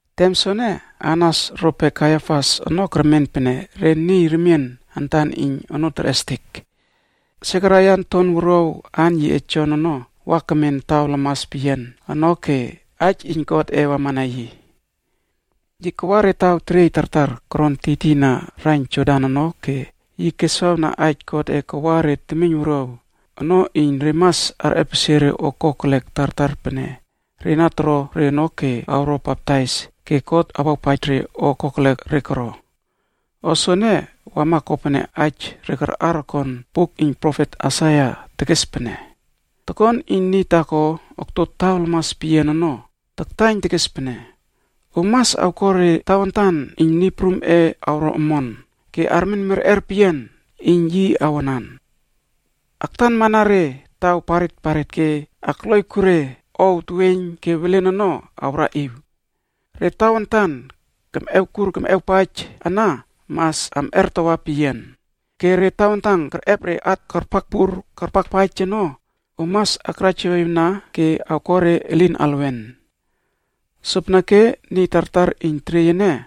Tem soene, Anas rope Kaiafasa ono kermen pene re niy remien antan iyn onoo terꞌestek. Sekaraia onton wuruaw aan yiꞌe Jon ono wa kemen taw lamas peyian re niy elin toron ono ke aij iyn Godꞌe wamana yi. Yi kawa re taw teriey tartar koron tiytiyna raiyn Jordan ono ke yi keswawna aij Godꞌe kawa re temiynwuruaw ono iyn re mas artapala ke arꞌepesie re o kokelek tartar pene re na toro re ono ke awro baptais, ke God awawpaij re o kokelek re koro. O soene wama kopene aij re karꞌar okon buk iyn profet Aisaia tekes pene: “Tokon iyn niy taako okto taw lamas peyian re niy elin toron ono, taktaiyn tekes pene, ‘Om mas awko re tawantan iyn Niy Prumꞌe awro omon ke armen merꞌer peyian iyn yi awanan. Aktanmana re taw barit barit ke akloiykur re ow teweiyn ke welen ono awraꞌiw. Re tawantan kemꞌewkur kemꞌewpaij ana mas amꞌertawa peyian, ke re tawantan kerꞌep re at karpakur karpakpaij ono, om mas akraijawaꞌiwna ke awko re elin alwen. Sopeneke niy tartar iyn teriey ene,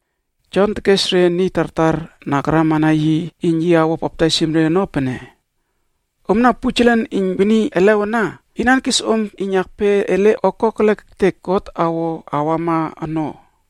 Jon tekes re niy tartar na akramana yi iyn yi awo baptaisim re ono pene, “Omna pujelen iyn weni elew ana, inan kes om iyn akpe ele o kokelek ektek God awo awama ono?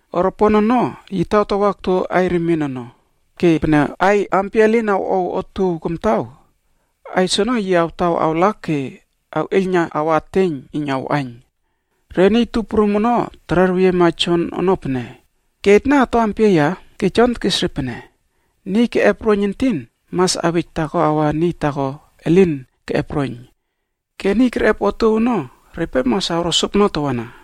Oropon ono, yi tawtawa okto aiy remien ono, ke pene aiy ampia elin awꞌow otuow kamtaw, aiy soono yi awtaw awla ke awꞌeiylna awa eteiyn iyn awꞌaiyn.” Re niy tup prum ono tererweyiema Jon ono pene, “Ke etne ato ampia ya?” Ke Jon tekes re pene, “Niy keꞌep siot entin, mas awej taako awa niy taako elin keꞌep siot. Ke niy kerꞌep otuow ono, repe mas awro sopono tawana.”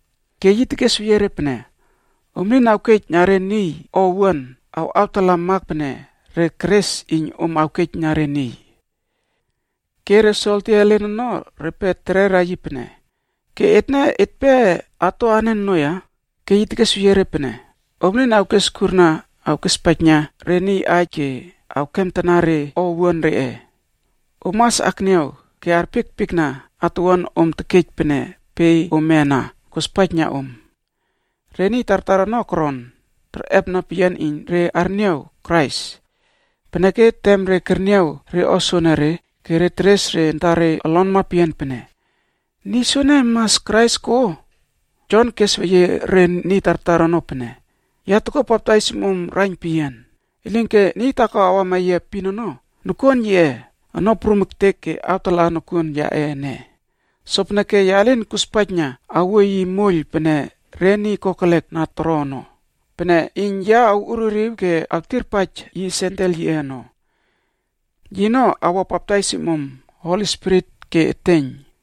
Ke yi tekesweyie re pene, “Om lin awkej na re niy atuwuan awꞌawtalaꞌa mak pene re keres iyn om awkej na re niy.” Ke re soldia elen ono repe terera yi pene, “Ke etne etpe ato anen ono ya?” Ke yi tekesweyie re pene, “Om lin awkeskurna awkespaijna re niy aij ke awkemtana re owuan reꞌe. Om mas akniaw ke arpiekpiekna atuwuan om tekej pene pe ome ana, kospaijna om.” Re niy tartar ono koron terꞌepna peyian iyn re arniaw Krais.c Peneke tem re kerniaw re o soenere, ke re teres re antare olonma peyian pene, “Niy soene mas Krais ko?” Jon tekesweyie re niy tartar ono pene, “Ya takuo baptaisim om raiyn peyian, elinke niy taako awama yia epin ono, nokuon yiꞌe ono prum ektek ke awtala nokuon yaꞌe ene. Sopeneke ya lin kuspaijna awuo yi moiyl pene re niy kokelek na toro ono, pene ya awtumtum taiyl iyn takapot sendel yiꞌe ono. Yino awo baptaisim om Holi Spirit ke eteiyn.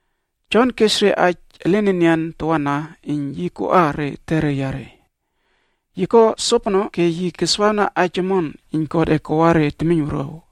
Jon kes re aij elen enian tawana iyn yi koꞌa re etere yare. Yi ko sopono ke yi keswawna aij omon Iyn Godꞌe kawa re temiyn wuruaw.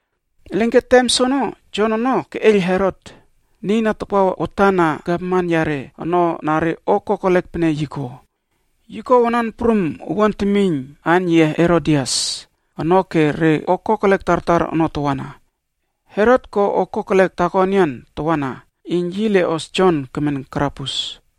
Elinke tem soene, Jon ono keꞌeiyl Herot, niy na takwa watan na gavman yare ono na re o kokelek pene yi ko. Yi ko wanan prum owuan temiyn aan yiꞌe Herodias ono ke re o kokelek tartar ono tawana. Herot ko o kokelek taako enian tawana iyn yi leꞌos Jon kemen karabus.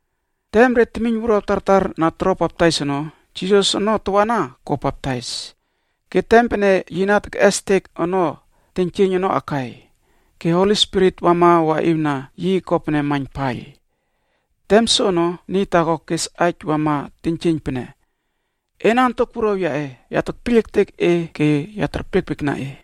Tem re temiyn wuruaw tartar na toro baptais ono, Jisas ono tawana ko baptais. Ke tem pene yi na tekꞌestek ono teiynjieiyn ono akai. Ke Holi Spirit wama waꞌiwna yi kopene maiyn paiyl. Tem soono niy taako kes aij wama teiynjieiyn pene, “Ena ontok wuruaw yaꞌe ya tekpiyl ektek e ke ya terpiekpiekna e.”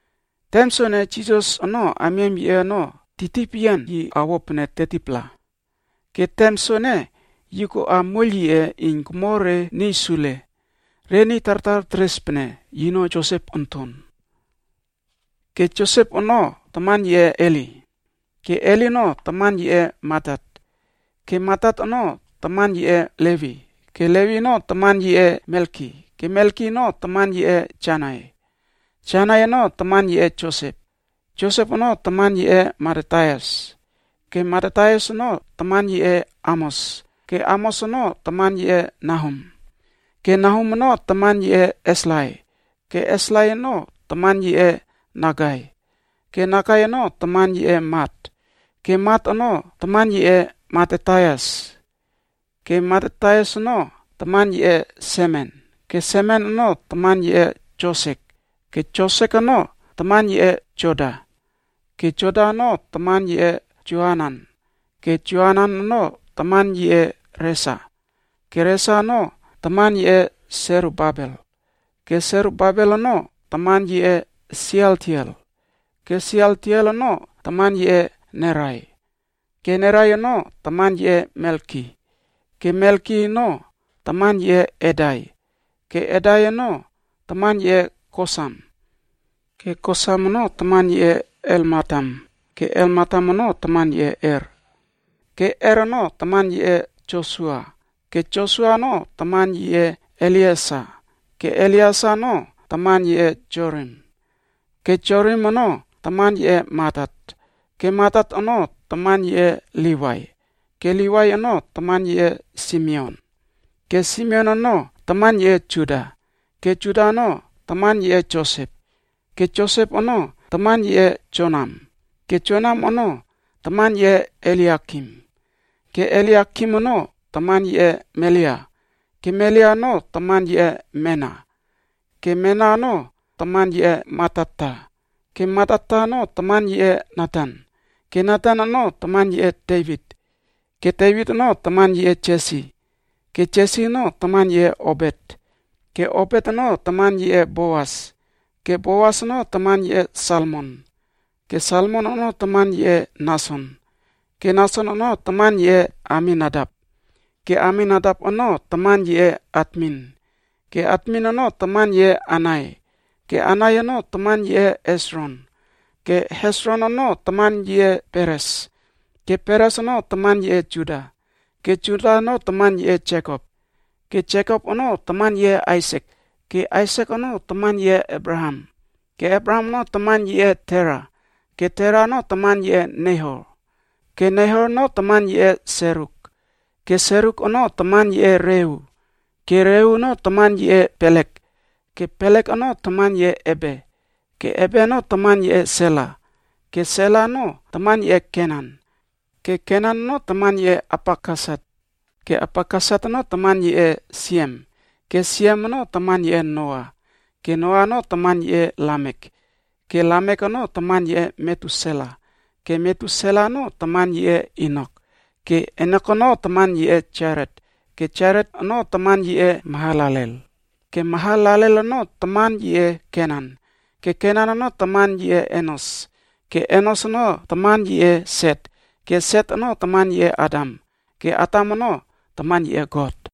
Tem soene Jisas ono amiam yiꞌe ono tiytiy peyian yi awo pene 30-pla. Ke tem soene yi koa moiyl yiꞌe iyn komo re niy sule. Re niy tartar teres pene yino Josep onton. Ke Josep ono taman yiꞌe Heli. Ke Heli ono taman yiꞌe Matat, ke Matat ono taman yiꞌe Levi, ke Levi ono taman yiꞌe Melki, ke Melki ono taman yiꞌe Janai. Janai ono taman yiꞌe Josep. Josep ono taman yiꞌe Matatias, ke Matatias ono taman yiꞌe Amos, ke Amos ono taman yiꞌe Nahum, ke Nahum ono taman yiꞌe Esli, ke Esli ono taman yiꞌe Nagai. Ke Nagai ono taman yiꞌe Mat, ke Mat ono taman yiꞌe Matatias, ke Matatias ono taman yiꞌe Semen, ke Semen ono taman yiꞌe Josek, ke Josek ono taman yiꞌe Joda. Ke Joda ono taman yiꞌe Joanan, ke Joanan ono taman yiꞌe Resa, ke Resa ono taman yiꞌe Serubabel, ke Serubabel ono taman yiꞌe Sealtiel, ke Sealtiel ono taman yiꞌe Neri. Ke Neri ono taman yiꞌe Melki, Ke Melki ono taman yiꞌe Adi, ke Adi ono taman yiꞌe Kosam, ke Kosam ono taman yiꞌe Elmadam, ke Elmadam ono taman yiꞌe Er. Ke Er ono taman yiꞌe Josua, ke Josua ono taman yiꞌe Elieser, ke Elieser ono taman yiꞌe Jorim, ke Jorim ono taman yiꞌe Matat, Matat ono taman yiꞌe Livai. Ke Livai ono taman yiꞌe Simeon, ke Simeon ono taman yiꞌe Juda, ke Juda ono taman yiꞌe Josep, ke Josep ono taman yiꞌe Jonam, ke Jonam ono taman yiꞌe Eliakim. Ke Elaiakim ono taman yiꞌe Melea, ke Melea ono taman yiꞌe Mena, ke Mena ono taman yiꞌe Matata, ke Matata ono taman yiꞌe Natan, ke Natan ono taman yiꞌe Devit. Ke Devit ono taman yiꞌe Jesi, ke Jesi ono taman yiꞌe Obet, ke Obet ono taman yiꞌe Boas, ke Boas ono taman yiꞌe Salmon, ke Salmon ono taman yiꞌe Nason. Ke Nason ono taman yiꞌe Aminadab, ke Aminadab ono taman yiꞌe Atmin, ke Atmin ono taman yiꞌe Arni, ke Arni ono taman yiꞌe Hesron, ke Hesron ono taman yiꞌe Peres, ke Peres ono taman yiꞌe Juda. Ke Juda ono taman yiꞌe Jekop, ke Jekop ono taman yiꞌe Aisak, ke Aisak ono taman yiꞌe Abraham, ke Abraham ono taman yiꞌe Tera, ke Tera ono taman yiꞌe Nahor. Ke Nahor ono taman yiꞌe Seruk, ke Seruk ono taman yiꞌe Reu, ke Reu ono taman yiꞌe Pelek, ke Pelek ono taman yiꞌe Eber, ke Eber ono taman yiꞌe Sela. Ke Sela ono taman yiꞌe Kenan, ke Kenan ono taman yiꞌe Arpaksat. Ke Arpaksat ono taman yiꞌe Siem, ke Siem ono taman yiꞌe Noa. Ke Noa ono taman yiꞌe Lamek. Ke Lamek ono taman yiꞌe Metusala, ke Metusala ono taman yiꞌe Enok, ke Enok ono taman yiꞌe Jaret, ke Jaret ono taman yiꞌe Mahalalel, ke Mahalalel ono taman yiꞌe Kenan. Ke Kenan ono taman yiꞌe Enos, ke Enos ono taman yiꞌe Set, ke Set ono taman yiꞌe Adam. Adam ono taman yiꞌe God.